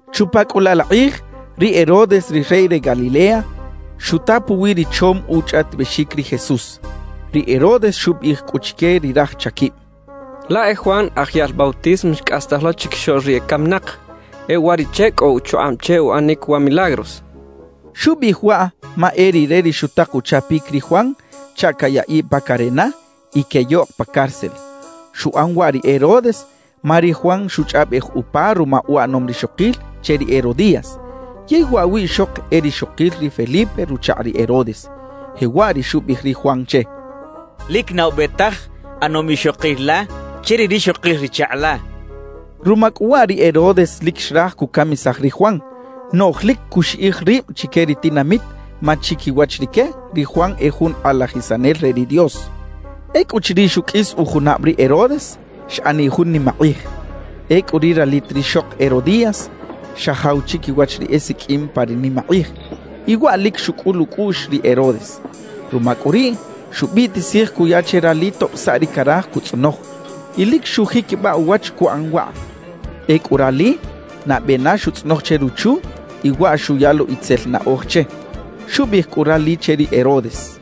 Chupa cꞌu laꞌ la kꞌij, ri Herodes ri rey re Galilea xuta puwi ri chom uchꞌaꞌtibexic ri Jesús. Ri Herodes xubiꞌij cꞌu chique ri raj chaquib: «Laꞌ e Juan Aj Yaꞌl Bautismo xcꞌastaj lo chiquixoꞌl ri ecaminak; e uwariꞌche cꞌo uchukꞌab che uꞌanic wa milagros» xchaꞌ. Xubiꞌij waꞌ ma e rire ri xutak uchapic ri Juan chaꞌ cayaꞌiꞌ pa carena y queyoꞌk pa cárcel. Xuꞌan waꞌ ri Herodes ma ri Juan xuchꞌaꞌbej upa ruma uꞌanom rixokil che ri Herodías, yey waꞌ wiꞌxok e rixokil ri Felipe ruchakꞌ ri Herodes. Jewaꞌ ri xubiꞌij ri Juan che: «Lic na ube taj ꞌanom ixokil la che ri rixokil ri chakꞌ la» xchaꞌ. Ruma cꞌu waꞌ ri Herodes lic xraj cucamisaj ri Juan, noꞌj lic cuxiꞌij rib chique ri tinamit ma chiquiwach rique ri Juan e jun kꞌalajisanel re ri Dios. Ecꞌuchiriꞌ xuqꞌuis ujunab ri Herodes, xꞌaniꞌ jun nimakꞌij. Ecꞌu ri ralit rixok Herodías xajaw chiquiwach ri esiqꞌuim pa ri nimakꞌij, y waꞌ lic xucꞌul ucꞌuꞌx ri Herodes. Ruma cꞌu riꞌ, xubiꞌtisij cuya che rali tob saꞌ ri caraj cutzꞌonoj, y lic xujiquibaꞌ uwach cuꞌan waꞌ. Ecꞌu rali nabe na xuꞌtzꞌonoj che ruchu y waꞌ xuya lo itzel naꞌoj che. Xubiꞌij cꞌu rali che ri Herodes: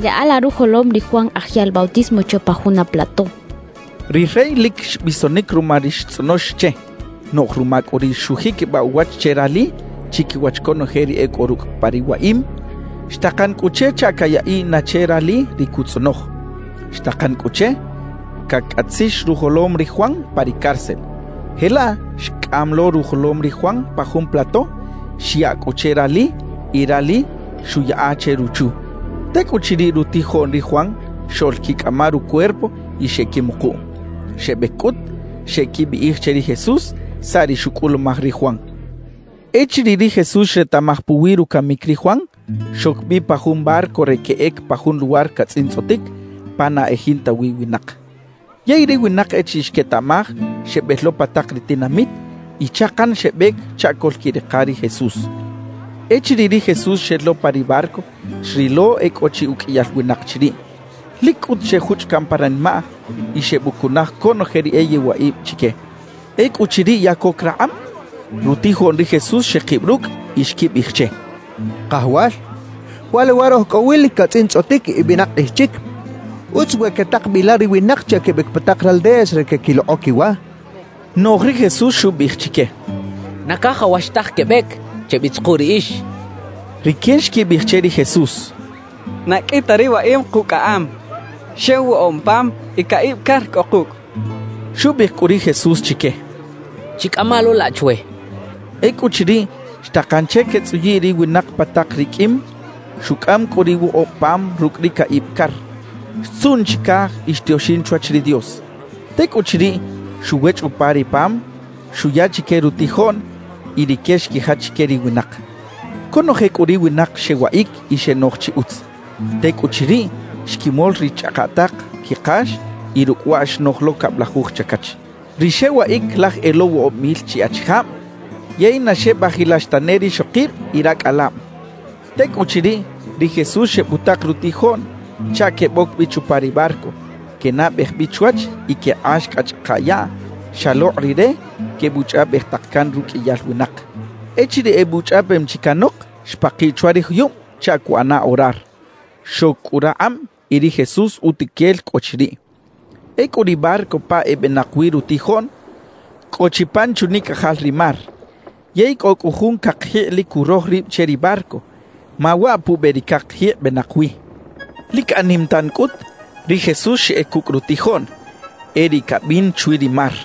«Yaꞌa la rujolom ri Juan Aj Yaꞌl Bautismo chwe pa juna plato» xchaꞌ. Ri rey lic xbisonic ruma ri xtzꞌonox che. Noꞌj ruma cꞌu ri xujiquibaꞌ uwach che rali chiquiwach conoje ri e cꞌo rucꞌ pa ri waꞌim, xtakan cꞌu che chaꞌ cayaꞌiꞌ na che rali ri cutzꞌonoj. Xtakan cꞌu che cacꞌatzix rujolom ri Juan pa ri cárcel. Jelaꞌ xcꞌam lo rujolom ri Juan pa jun plato, xyaꞌ cꞌu che rali y rali xuꞌyaꞌa che ruchu. Tecꞌuchiriꞌ, rutijoꞌn ri Juan xoꞌlquicꞌama rucuerpo y xeꞌquimukuꞌ. Xebec cꞌut, xeꞌquibiꞌij che ri Jesús saꞌ ri xucꞌulumaj ri Juan. Echiriꞌ ri Jesús xretaꞌmaj puwi rucamic ri Juan, xoc bi pa jun barco re queꞌec pa jun luwar catzꞌintzꞌotic pa na e jinta wi winak. Yey ri winak echiriꞌ xquetaꞌmaj, xebel lo pa tak ri tinamit y chakan xebec chaꞌ coꞌlquirika ri Jesús. Echiriꞌ ri Jesús xel lo pa ri barco, xrilo e cꞌo chi uqꞌuiyal winak chiriꞌ. Lic cꞌut xejuchꞌ caꞌn pa ranimaꞌ y xebucunaj conoje ri e yewaꞌib chique. Ecꞌuchiriꞌ ya coc rakꞌab, rutijoꞌn ri Jesús xekib rucꞌ y xquibiꞌij che: —Kajawal, wa luwar oj cꞌo wi lic catzꞌintzꞌotic y benak kꞌij chic. Utz we quetak bi la ri winak chaꞌ quebec pa tak raldeas re queꞌquilokꞌo quiwa —xechaꞌ. Noꞌj ri Jesús xubiꞌij chique: —Na cajawax taj quebec; chebitzuku riꞌix —xchaꞌ. Rique xquibiꞌij che ri Jesús: —Na qꞌui ta ri waꞌim kucꞌaꞌam, xew woꞌob pam y caꞌib car cꞌo kucꞌ —xechaꞌ. Xubiꞌij cꞌu ri Jesús chique: —Chicꞌama lo laꞌ chwe —xchaꞌ. Ecꞌuchiriꞌ, xtakan che quetzꞌuyiꞌ ri winak pa tak ri qꞌuim. Xucꞌam cꞌu ri woꞌob pam rucꞌ ri caꞌib car, xtzuꞌn chicaj y xtioxin chwach ri Dios. Tecꞌuchiriꞌ, xuwechꞌ upa ri pam, xuya chique rutijoꞌn y rique xquijach chique ri winak. Conoje cꞌu ri winak xewaꞌic y xenoj chi utz. Tecꞌuchiriꞌ, xquimol ri chꞌakaꞌtaꞌk quikax y rucꞌ waꞌ xnoj lo cablajuj chacach. Ri xewaꞌic laj e lo woꞌob mil chi achijab yey na xebajilax tane rixokib y racꞌalab. Tecꞌuchiriꞌ, ri Jesús xebutak rutijoꞌn chaꞌ queboc bi chupa ri barco, quenabej bi chwach y quekꞌax cꞌa chꞌaka yaꞌ xalokꞌ Rire quebuchꞌaꞌbej tak can ruqꞌuiyal winak. Echiriꞌ ebuchꞌaꞌbem chi canok, xpakiꞌ chwa ri juyub chaꞌ cuꞌana orar. Xoc cꞌu rakꞌab, y ri Jesús utuquel cꞌo chiriꞌ. Ecꞌu ri barco pa ebenak wi rutijoꞌn cꞌo chi pan chunicꞌajal ri mar, yey cꞌo cꞌu jun cakjikꞌ lic curoj rib che ri barco, ma waꞌ pube ri cakjikꞌ benak wi. Lic anim tan cꞌut, ri Jesús xeꞌec cucꞌ rutijoꞌn, e riꞌ cabin chwi ri mar.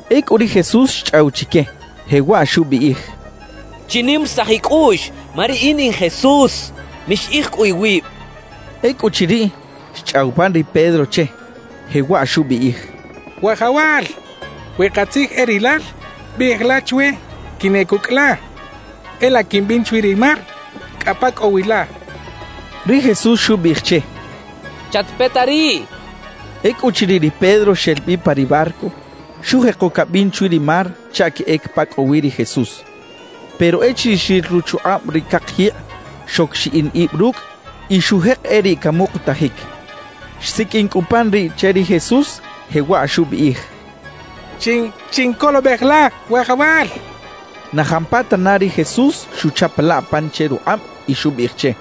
Ecꞌu ri Jesús xchꞌaw chique, jewaꞌ xubiꞌij: —Chinimarisaj icꞌuꞌx, ma riꞌin in Jesús; mixiꞌij cꞌu iwib —xchaꞌ. Ecꞌuchiriꞌ, xchꞌaw pan ri Pedro che, jewaꞌ xubiꞌij: —Wajawal, we katzij e rilal, biꞌij la chwe quinꞌec ucꞌ la, e laꞌ quimbin chwi ri mar cꞌa pa cꞌo wi la —xchaꞌ. Ri Jesús xubiꞌij che: —Chatpeta riꞌ —xchaꞌ. Ecꞌuchiriꞌ ri Pedro xel bi pa ri barco, xujeko cabin chwi ri mar chaꞌ queꞌec pa cꞌo wi ri Jesús. Pero echiriꞌ xril ruchukꞌab ri cakjikꞌ, xoc xiꞌin ib rucꞌ y xujek e riꞌ camukutajic. Xsiqꞌuin cꞌu pan riꞌ che ri Jesús, jewaꞌ xubiꞌij: —¡Chincolobej la, Wajawal! —xchaꞌ. Na jampatana ri Jesús xuchapalaꞌ pan che rukꞌab y xubiꞌij che: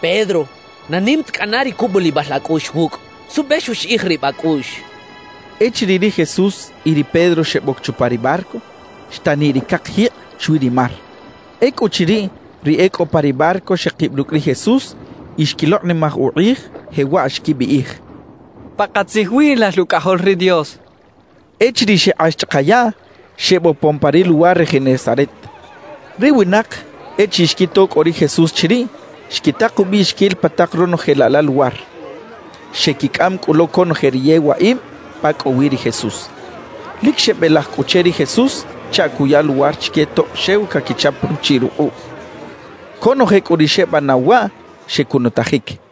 —Pedro, ¡na nim ta cꞌana ri cubulibal acꞌuꞌx wucꞌ! ¿Suꞌbe xuxiꞌij rib acꞌuꞌx? —xchaꞌ. Echiriꞌ ri Jesús y ri Pedro xeboc chupa ri barco, xtaniꞌ ri cakjikꞌ chwi ri mar. Ecꞌuchiriꞌ, ri e cꞌo pa ri barco xekib rucꞌ ri Jesús y xquilokꞌnimaj ukꞌij, jewaꞌ xquibiꞌij: —Pakatzij wi lal Ucꞌajol ri Dios —xechaꞌ. Echiriꞌ xekꞌax chꞌaka yaꞌ, xebopon pa ri luwar re Genesaret. Ri winak, echiriꞌ xquito cꞌo ri Jesús chiriꞌ, xquitak ubiꞌxiquil pa tak ronoje laꞌ la luwar. Xequicꞌam cꞌu lo conoje ri yewaꞌib pa cꞌo wi ri Jesús. Lic xebelaj cꞌu che ri Jesús chaꞌ cuya luwar chique tob xew caquichap ruchiꞌ rukꞌuꞌ. Conoje cꞌu ri xebanaw waꞌ, xecunutajic.